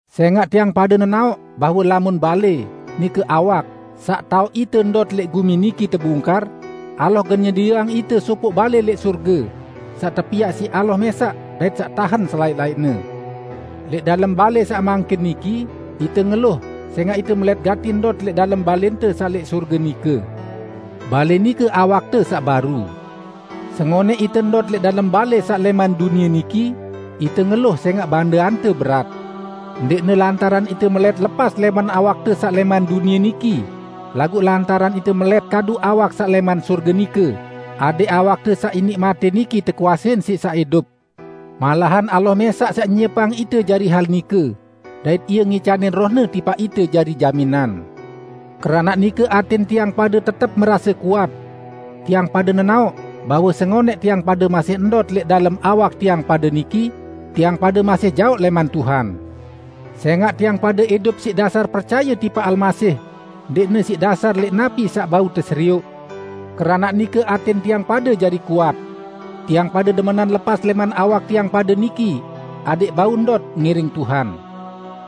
Sẽngaq tiang pade nenaoq bahwe lamun balẽ -- nike awak -- saq taoq ite ndot lẽq gumi niki tebungkar, Allah gen nyedieang ite sopoq balẽ lẽq sorge, saq tepiaq siq Allah mẽsaq dait saq tahen selaẽq-laẽqne. Lẽq dalem balẽ saq mangkin niki, ite ngeluh sẽngaq ite melẽt gati ndot lẽq dalem balẽnte saq lẽq sorge nike. Balẽ nike awakte saq baru. Sengonẽq ite ndot lẽq dalem balẽ saq lẽman dunie niki, ite ngeluh sẽngaq bandeante berat. Ndẽqne lantaran ite melẽt lepas lẽman awakte saq lẽman dunie niki, laguq lantaran ite melẽt kadu awak saq lẽman sorge nike, adẽq awakte saq iniq matẽ niki tekuasein siq saq idup. Malahan Allah mẽsaq saq nyiepang ite jari hal nike, dait Ie ngicanin Roh-Ne tipaq ite jari jaminan. Keranaq nike atẽn tiang pade tetep merase kuat. Tiang pade nenaoq bahwe sengonẽq tiang pade masih ndot lẽq dalem awak tiang pade niki, tiang pade masih jaoq lẽman Tuhan. Sẽngaq tiang pade idup siq dasar percaye tipaq Almasih, ndẽqne siq dasar lẽq napi saq bau teserioq, keranaq nike atẽn tiang pade jari kuat. Tiang pade demenan lepas lẽman awak tiang pade niki, adẽq bau ndot ngiring Tuhan.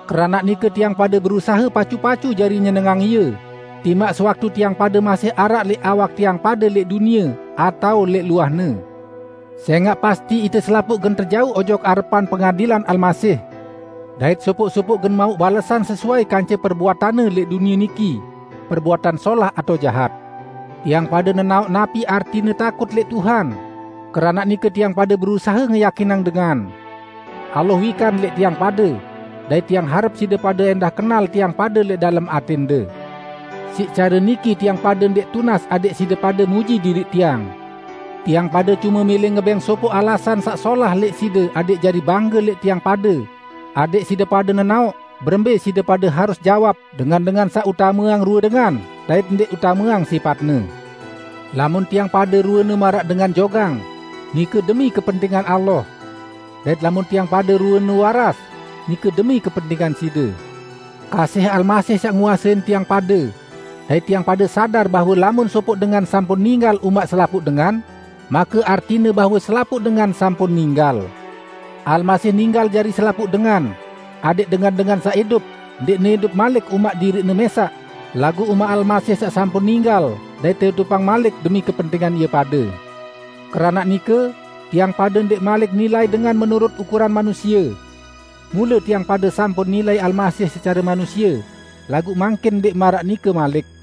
Keranaq nike tiang pade berusahe pacu-pacu jari nyenengang Ie, timaq sewaktu tiang pade masih araq lẽq awak tiang pade lẽq dunie, atao lẽq luahne. Sẽngaq pasti ite selapuq gen tejauq ojok arepan pengadilan Almasih, dait sopoq-sopoq gen mauq balesan sesuai kance perbuatanne lẽq dunie niki -- perbuatan solah atao jahat. Tiang pade nenaoq napi artine takut lẽq Tuhan; keranaq nike tiang pade berusahe ngeyakinang dengan. Allah wikan lẽq tiang pade, dait tiang harep side pade ẽndah kenal tiang pade lẽq dalem atẽnde. Siq care niki tiang pade ndẽq tunas adẽq side pade muji diriq tiang. Tiang pade cume mẽlẽ ngebẽng sopoq alasan saq solah lẽq side adẽq jari bangge lẽq tiang pade, adẽq side pade nenaoq berembẽ side pade harus jawab dengan-dengan saq utameang rue dengan dait ndẽq utameang sipatne. Lamun tiang pade ruene maraq dengan jogang, nike demi kepentingan Allah. Dait lamun tiang pade ruene waras, nike demi kepentingan side. Kasih Almasih saq nguasein tiang pade; dait tiang pade sadar bahwe lamun sopoq dengan sampun ninggal umaq selapuq dengan, make artine bahwe selapuq dengan sampun ninggal. Almasih ninggal jari selapuq dengan, adẽq dengan-dengan saq idup, ndẽqne idup malik umaq diriqne mẽsaq, laguq umaq Almasih saq sampun ninggal dait teidupang malik demi kepentingan ie pade. Keranaq nike, tiang pade ndẽq malik nilai dengan menurut ukuran manusie. Mule tiang pade sampun nilai Almasih secare manusie, laguq mangkin ndẽq maraq nike malik.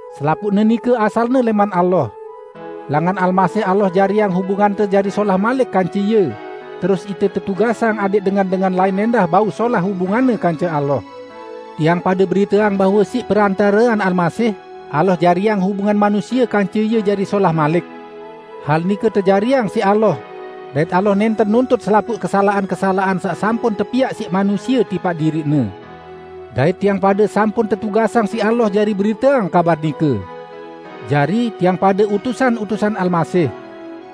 Selapuqne nike asalne lẽman Allah. Langan Almasih Allah jariang hubungante jari solah malik kance Ie, terus ite tetugasang adẽq dengan-dengan lain ẽndah bau solah hubunganne kance Allah. Tiang pade beriteang bahwe siq perantarean Almasih, Allah jariang hubungan manusie kance Ie jari solah malik. Hal nike tejariang siq Allah dait Allah nẽnten nuntut selapuq kesalaqan-kesalaqan saq sampun tepiaq siq manusie tipaq diriq-Ne. Dait tiang pade sampun tetugasang siq Allah jari beriteang kabar nike. Jari, tiang pade utusan-utusan Almasih.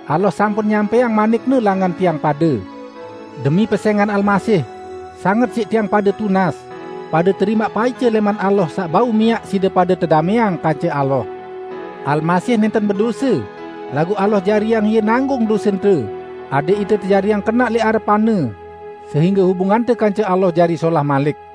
Allah sampun nyampẽang manik-Ne langan tiang pade. Demi pesẽngan Almasih, sanget siq tiang pade tunas: Pade terimaq paice lẽman Allah saq bau miaq side pade tedamẽang kance Allah! Almasih nẽnten bedose, laguq Allah jariang Ie nanggung dosente, adẽq ite tejariang kenaq lẽq arepan-Ne sehingge hubungante kance Allah jari solah malik.